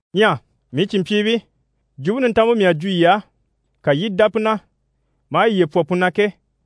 Ɲyɛ mii cìnmpyiibii, Jwumpe Nintanmpe mii à jwo yii á, ka yii i dá pu na, maa yiye pwɔ pu na ke,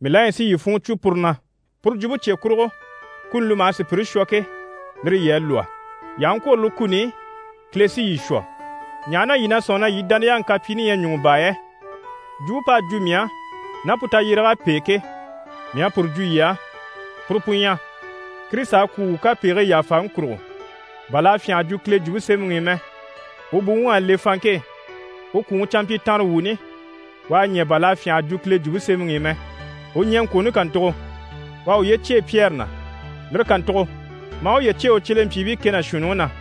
mii la ɲyɛ si yii funŋɔ cwo puru na. Puru jwumpe cye kurugo, kuni li maha sùpyire shwɔ ke, lire yii à lwɔ́. Yii aha ŋkwôro lire kuni i, Kile sí yii shwɔ. Ɲaha na yii na sɔ̂nŋi na yii dániyaŋi kapyiini ɲyɛ ɲùŋɔ baa yɛ? Jwumpe p'à jwo mii á, ná pu tayyéreg'à pêe ke, mii à puru jwo yii á. Puru pu ɲyɛ: Kirisita à kwû wuu kapegigii yàfaŋi kurugo, bà l'à fyânha a jwo Kile Jwumpe Semɛŋi i mɛ. U buwuŋ'à le fanŋke e, u kwùŋi canmpyitanrewuuni, u à ɲɛ̀, bà l'à fyânha a jwo Kile Jwumpe Semɛŋi i mɛ. U ɲɛŋkwooni kàntugo, u à uye cyêe Pyɛri na, lire kàntugo, maa uye cyêe u cyelempyiibii kɛ ná shuunniŋi na.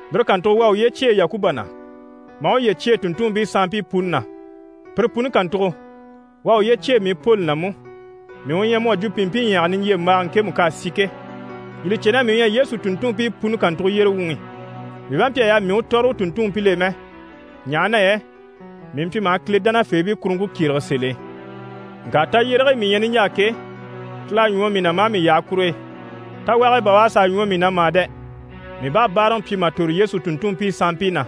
Lire kàntugo u à uye cyêe Yakuba na, maa uye cyêe u tùnntunmpii sanmpii puni na. Pire puni kàntugo, u à uye cyêe mii Poli na mú, mii u ɲyɛ mu à jwo pìnmpinɲyaga niɲjyembaga ŋkemu k'à si ke. Yii li cè, mii u ɲyɛ Yesu tùnntunmpii puni kàntugo yyére wuŋi. Mii bá mpyi a yaa mii u tɔ̀rɔ u tùnntunmpil'e mɛ, ɲaha na yɛ mii mpyi maha Kile dánafeebii kuruŋke kyérege sèl'e. Ŋka tayyérege e mii ɲyɛ niɲjaa ke, Kile u à ɲwɔ mii na maa mii yaha kur'e. Tawage e bà u à sàa ɲwɔ mii na mà dɛ! Mii bá à báaraŋi pyi mà tòro Yesu tùnntunmpii sanmpii na,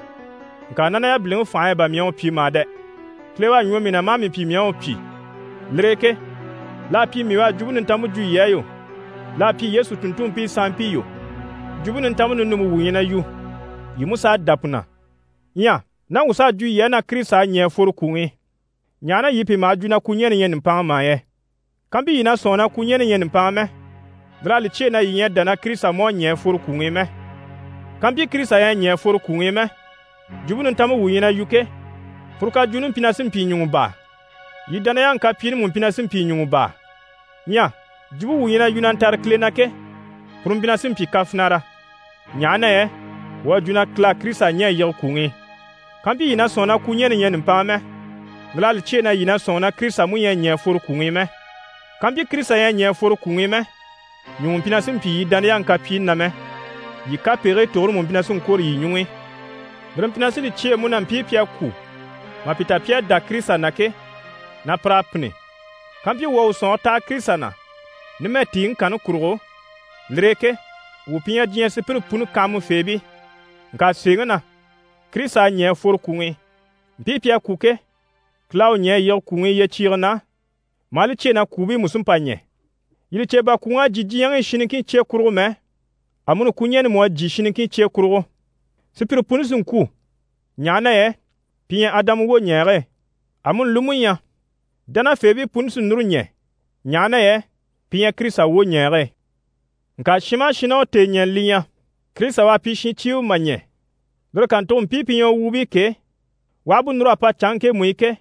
ŋka ná na yabiliŋi fànhe e bà mii à u pyi mà dɛ! Kile u à ɲwɔ mii na maa mii pyi mii à u pyi. Lire e ke l'à pyi mii u à Jwumpe Nintanmpe jwo yii á yo, l'à pyi Yesu tùnntunmpii sanmpii yo, Jwumpe Nintanmpe ninumpe wuu ɲyɛ na yu, yii mú s'à dá pu na. Ɲyɛ ná wuu s'à jwo yii á na Kirisita à ɲɛ̀ a fworo kwùŋi i, ɲaha na yii pìi maha jwo na kwuɲɛnɛ ɲyɛ nùmpanŋa mà yɛ? Kampyi yii na sɔ̂nŋi na kwuɲɛnɛ ɲyɛ nùmpanŋa mɛ, lir'à li cyêe na yii ɲyɛ a dá na Kirisita mú à ɲɛ̀ a fworo kwùŋi i mɛ. Kampyi Kirisita ɲyɛ a ɲɛ̀ a fworo kwùŋi i mɛ, Jwumpe Nintanmpe wuu ɲyɛ na yu ke, puru kajwuuni mpyi na sí n‑pyi ɲùŋɔ baa, yii dániyaŋi kapyiini mú mpyi na sí n‑pyi ɲùŋɔ baa. Ɲyɛ jwumpe wuu ɲyɛ na yu na ntare Kile na ke, puru mpyi na sí n‑pyi kafinara, ɲaha na yɛ wuu à jwo na Kile à Kirisita ɲɛ̀ a yige kwùŋi i. Kampyi yii na sɔ̂nŋi na kwuɲɛnɛ ɲyɛ nùmpanŋa mɛ, lir'à li cyêe na yii na sɔ̂nŋi na Kirisita mú ɲyɛ a ɲɛ̀ a fworo kwùŋi i mɛ. Kàmpyi Kirisita ɲyɛ a mpyi a ɲɛ̀ a fworo kwùŋi i mɛ, ɲùŋɔ mpyi na sí n-pyi yii dániyaŋi kapyiini na mɛ, yii kapegigii tugure mú mpyi na sí n‑kwôro yii ɲuŋ'i. Lire mpyi na sí li cyêe mú na mpii pi à kwû mà pi ta pi à dá Kirisita na ke, na pir'à pînni. Kampyi wuu à wuu sɔ̀nŋɔre taha Kirisita na numɛ tìiŋi kanni kurugo, lire e ke wuu pi ɲyɛ diɲyɛ sùpyire puni kanhamafeebii. Ŋka sèeŋi na, Kirisita à ɲɛ̀ a fworo kwùŋi i. Mpii pi à kwû ke, Kile à u ɲɛ̀ a yige kwùŋi i yyecyiige na, maa li cyêe na kwùubii mú sí n‑pa ɲɛ̀. Yii li cè, bà kwùŋ'à jyè diɲyɛŋi i shin niŋkin cye kurugo mɛ, amuni kwuɲɛni mú à jyè shin niŋkin cye kurugo. Sùpyire puni sí n‑kwû, ɲaha na yɛ pi ɲyɛ Adama wwoɲɛɛge e. Amuni li mú ɲyɛ, dánafeebii puni sí núru ɲɛ̀, ɲaha na yɛ pi ɲyɛ Kirisita wwoɲɛɛge e. Ŋka shin maha shin ná u tèeɲɛnɛ li ɲyɛ, Kirisita u à pyi shincyiiwe mà ɲɛ̀, lire kàntugo, mpii pi ɲyɛ u wuubii ke, u aha bú núr'a pa canŋke ŋkemu i ke,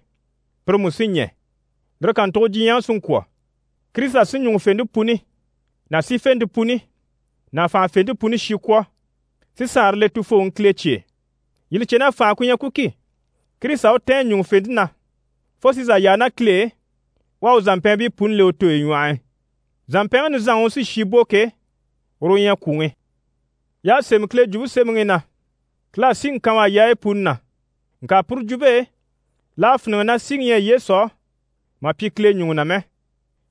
pire mú sí ɲɛ̀. Lire kàntugo diɲyɛŋi sí n‑kwɔ̀. Kirisita sí ɲùŋufente puni ná sífente puni ná fànhafente puni shi kwɔ̀, si Saanre le Tufooŋi Kile cye e. Yii li cè na fànha ku ɲyɛ ku ki, Kirisita u tɛ̀ɛn ɲùŋufente na fo si zà yaa ná Kile e, u à u zàmpɛɛnbii puni le u tooyi ɲwɔh'i. Zàmpɛnŋi nizanŋi u sí shi bò ke, uru u ɲyɛ kwùŋi. Y'à sémɛ Kile Jwumpe Semɛŋi i na: «Kile à síŋi kan u á yaayi puni na.» Ŋka puru jwumpe e, l'à fíniŋɛ na síŋi ɲyɛ Yesu á mà pyi Kile ɲùŋɔ na mɛ,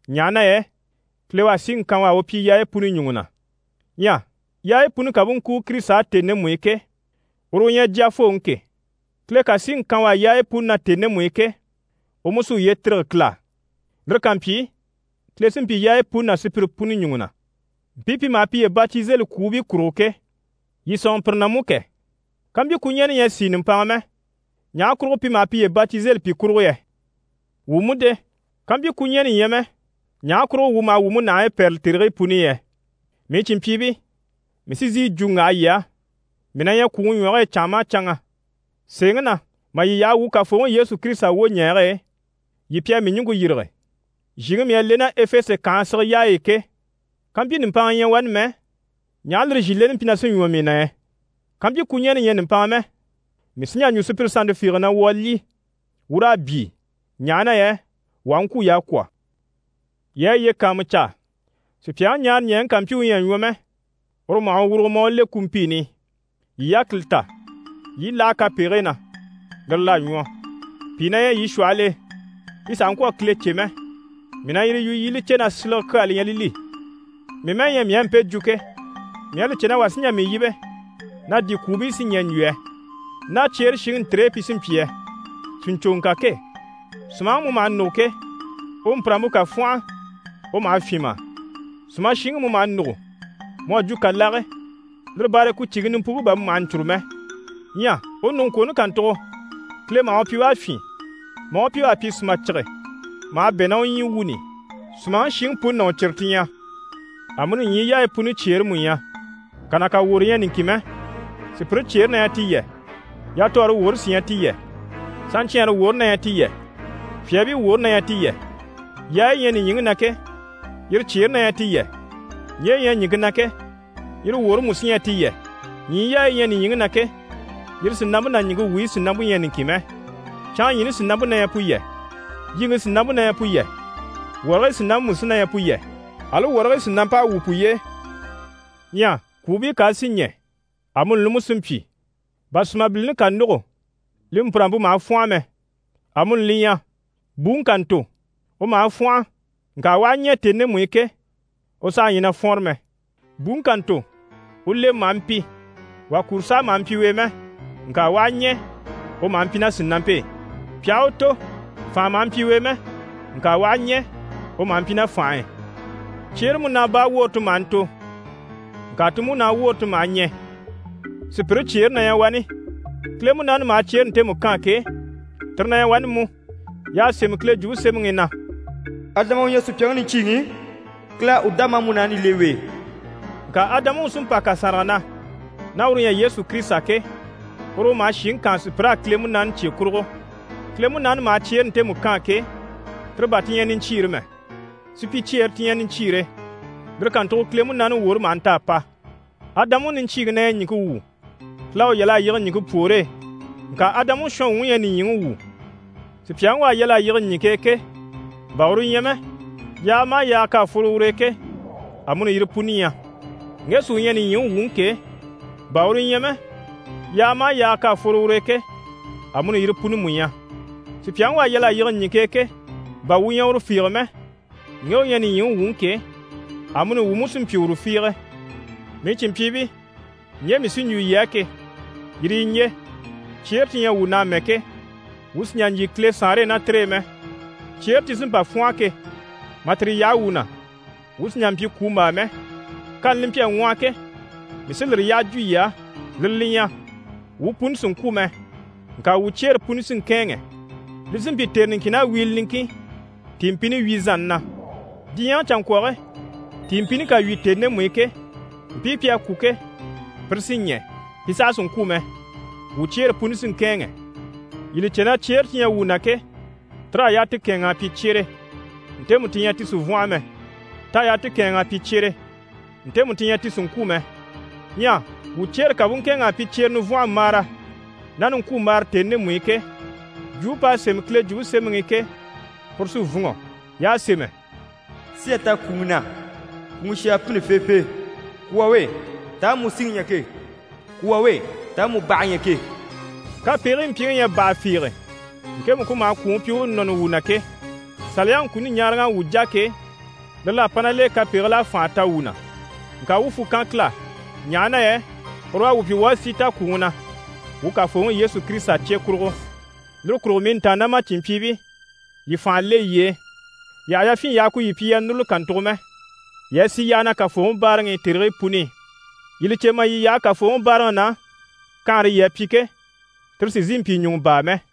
ɲaha na yɛ Kile u à síŋi kan u á u pyi yaayi puni ɲùŋɔ na. Ɲyɛ yaayi puni ká bú ŋkúu Kirisita á tèni ndemu i ke, uru u ɲyɛ Jyafooŋi ke, Kile ká síŋi kan u á yaayi puni na tèni ndemu i ke, u mú sí uye tîrige Kile á. Lire ká mpyi, Kile sí n‑pyi yaayi puni ná sùpyire puni ɲùŋɔ na. Mpii pi maha piye batizeli kwùubii kurugo ke, yii sɔ̂nŋɔ pire na mú kɛ, kampyi kwuɲɛnɛ ɲyɛ a sìi nùmpanŋa mɛ, ɲaha kurugo pi maha piye batizeli pi kurugo yɛ? Wuu mú de? Kampyi kwuɲɛnɛ ɲyɛ mɛ, ɲaha kurugo wuu maha wuu múnahigii pɛ́rɛli tèrigii puni i yɛ? Mii cìnmpyiibii, mii sí n‑sìi yi jwo n‑waha yii á, mii na ɲyɛ kwùŋi ɲwɔge e canŋa maha canŋa. Sèeŋi na, mà yii yaha wuu Kafooŋi Yesu Kirisita wwoɲɛɛge e, yii pi à mii ɲùŋke yîrige. Zhìŋi mii à le ná Efese kànhe sige yaayi i ke, kampyi nùmpanŋa ɲyɛ wani mɛ, ɲaha lire zhìleni mpyi na sí ɲwɔ mii na yɛ? Kampyi kwuɲɛnɛ ɲyɛ nùmpanŋa mɛ, mii sí n‑jà n‑jwo sùpyire sannte fiige na: «Wuu a lyî, wuu raa byii, ɲaha na yɛ wuu aha ŋkwû, y'à kwɔ̀.» Yii a yiye kàanmucaa: «Sùpyaŋi ɲaaraɲɛɛŋi ká mpyi u ɲyɛ a ɲwɔ mɛ, uru u maha u wurugo, maa u le kumpiini i.» Yii yákili ta, yii i láha kapegigii na, lire l'à ɲwɔ. Pìi na ɲyɛ yii shwɔhɔl'e, pi sàha ŋkwɔ̀ a Kile cè mɛ! Mii na yire yu yii i li cè na yii silege kyaa li ɲyɛ li li. Mii mɛ́ɛ ɲyɛ mii à mpe jwo ke, mii à li cè na wà sí n‑jà mii yíbe na di kwùubii sí ɲɛ̀ n‑jwo yɛ? Ná cyeere shiŋi ntire e pi sí n‑pyi yɛ? Sìɲcoŋɔ kà ke, sùmaŋi mu maha nûgo ke, u mpùrampe ká fwɔ́nhɔ, u maha fyîn mà? Sùmashiŋi mu maha nûgo, mu à jwo kàlage. Lire baare e ku cige nimpuŋke bà mu maha sà ɲcûru mɛ. Ɲyɛ u nùguŋkwooni kàntugo, Kile maha u pyi u à fyîn maa u pyi u à pyi sùmacige, maha bɛ̂ ná u ɲyii wuuni i. Sùmaŋi shiŋi puni ná u cire ti ɲyɛ. Amuni ɲyii yaayi puni cyeere mú ɲyɛ, kà ná kà woro ɲyɛ niŋkin mɛ. Sùpyire cyeere na ɲyɛ ti yɛ, yatɔɔre woore sí ɲyɛ ti yɛ, saɲcɛɛnre woore na ɲyɛ ti yɛ, fyaabii woore na ɲyɛ ti yɛ. Yaayi yi ɲyɛ nìɲyiŋi na ke, yire cyeere na ɲyɛ ti yɛ, ɲje yi ɲyɛ ɲìŋke na ke, yire woore mú sí ɲyɛ ti yɛ. Ɲyii yaayi yi ɲyɛ nìɲyiŋi na ke, yire sìnampe ná ɲìŋke wuyi sìnampe ɲyɛ niŋkin mɛ. Canŋaɲyiini sìnampe na ɲyɛ pu yɛ, yiŋke sìnampe na ɲyɛ pu yɛ, wɔrigii sìnampe mú sí na ɲyɛ pu yɛ, ali wɔrigii sìnamp'à wwû puye e. Ɲyɛ kwùubii ká a sì ɲɛ̀, amuni li mú sí n‑pyi. Bà sùmabilini ká nûgo, li mpùrampe maha fwɔ́nhɔ mɛ, amuni li ɲyɛ, buŋi ká ntò, u maha fwɔ́nhɔ, ŋka u aha ɲɛ̀ tèni ndemu i ke, u saha ɲyɛ na fwɔ́nre mɛ. Buŋi ká ntò, u lemɛ maha mpi, wà kuro sàha maha mpyi u e mɛ, ŋka u aha ɲɛ̀, u maha mpyi ná sìnampe e. Pi aha u tò, fànha maha mpyi u e mɛ, ŋka u aha ɲɛ̀, u maha mpyi ná fành'e. Cyeere múnaa baa woore ti maha ntò, ŋka ti múnaa woore ti maha ɲɛ̀. Sùpyire cyeere na ɲyɛ wani, Kile Munaani maha cyeere ntemu kaan ke, tire na ɲyɛ wani mú. Y'à sémɛ Kile Jwumpe Semɛŋi i na: «Adama u ɲyɛ sùpyaŋi niɲcyiiŋi, Kile à u dá maa múnaani le u e.» Ŋka Adamaŋi u sí n‑pa kàsanraga na, ná uru u ɲyɛ Yesu Kirisita ke, uru u maha shìŋi kaan sùpyir'á Kile Munaani cye kurugo. Kile Munaani maha cyeere ntemu kaan ke, tire bà ti ɲyɛ niɲcyiire mɛ, supyicyeere ti ɲyɛ niɲcyiire, lire kàntugo Kile Munaani woore maha nta a pa. Adamaŋi niɲcyiiŋi na ɲyɛ ɲìŋke wu, Kile à u yal'a yige pwoore e, ŋka Adamaŋi shɔnwuŋi ɲyɛ nìɲyiŋi wu. Sùpyaŋi u à yal'a yige ɲìŋke e ke, bà uru ɲyɛ mɛ, yaaga maha yaaga k'à fworo ur'e ke, amuni yire puni ɲyɛ. Ŋge sí u ɲyɛ nìɲyiŋi wuŋi ke, bà uru ɲyɛ mɛ, yaaga maha yaaga k'à fworo ur'e ke, amuni yire puni mú ɲyɛ. Sùpyaŋi u à yal'a yige ɲìŋke e ke, bà wuu ɲyɛ uru fiige mɛ, ŋge u ɲyɛ nìɲyiŋi wuŋi ke, amuni wuu mú sí n‑pyi uru fiige. Mii cìnmpyiibii, ɲje mii sí n‑jwo yii á ke, yire yi ɲje: cyeere ti ɲyɛ wuu na amɛ ke, wuu sì n‑jà n‑jyè Kile Saanre e ná tire e mɛ. Cyeere ti sí n‑pa n-fwɔ́nhɔ ke, mà tire yaha wuu na, wuu sì n‑jà n‑pyi kwùmbaa mɛ. Kani li mpyi a ŋwɔhɔ ke, mii sí lire yyaha jwo yii á, lire li ɲyɛ, wuu puni sì n‑kwû mɛ, ŋka wuu cyeere puni sí n‑kɛ̂ɛnŋɛ. Li sí n‑pyi tère niŋkin ná wiile niŋkin tìinmpini wyìzanni na. Diɲyɛŋi canŋkwɔge tìinmpini ká wyì tèni ndemu i ke, mpii pi à kwû ke, pire sí ɲɛ̀, pi saha sì n‑kwû mɛ, wuu cyeere puni sí n‑kɛ̂ɛnŋɛ. Yii li cè na cyeere ti ɲyɛ wuu na ke, tir'à yaa ti kɛ̂ɛnŋ'a pyi cyere, ntemu ti ɲyɛ ti sì n‑fwɔ́nhɔ mɛ. T'à yaa ti kɛ̂ɛnŋ'a pyi cyere ntemu ti ɲyɛ ti sì n‑kwû mɛ. Ɲyɛ wuu cyeere ká bú ŋkɛ̂ɛnŋ'a pyi cyere nivwɔnhɔmbaara ná niŋkwumbaara tèni ndemu i ke, jwumpe p'à sémɛ Kile Jwumpe Semɛŋi i ke, puru sí n‑fûnŋɔ. Y'à sémɛ: «Sí à ta kwùŋi na, kwùŋi shi à pînni feefee!» «Kwù wà we, taha mu síŋi ɲyɛ ke? Kwù wà we, taha mu bàhe ɲyɛ ke?» Kapegigii mpyiŋi ɲyɛ baha fiige, ŋkemu ku maha kwùŋi pyi u u nɔni wuu na ke. Saliyaŋi kuni ɲaaraŋ'à wuu jà ke, lire l'à pa ná l'e kapegigil'à fànha ta wuu na. Ŋka wuu à fwù kan Kile á, ɲaha na yɛ uru u à wuu pyi wuu à sí ta kwùŋi na, wuu Kafooŋi Yesu Kirisita cye kurugo. Lire kurugo mii ntàannamacinmpyiibii, yii fànha le yiye e, yii àha yafyin yaha ku yii pyi yii a núruli kàntugo mɛ, yii a sì yyaha na Kafooŋi báaraŋi i tèrigii puni i. Yii li cè mà yii yaha Kafooŋi báaraŋi na, kanhare yii à pyi ke, tire sì n‑sìi n‑pyi ɲùŋɔ baa mɛ.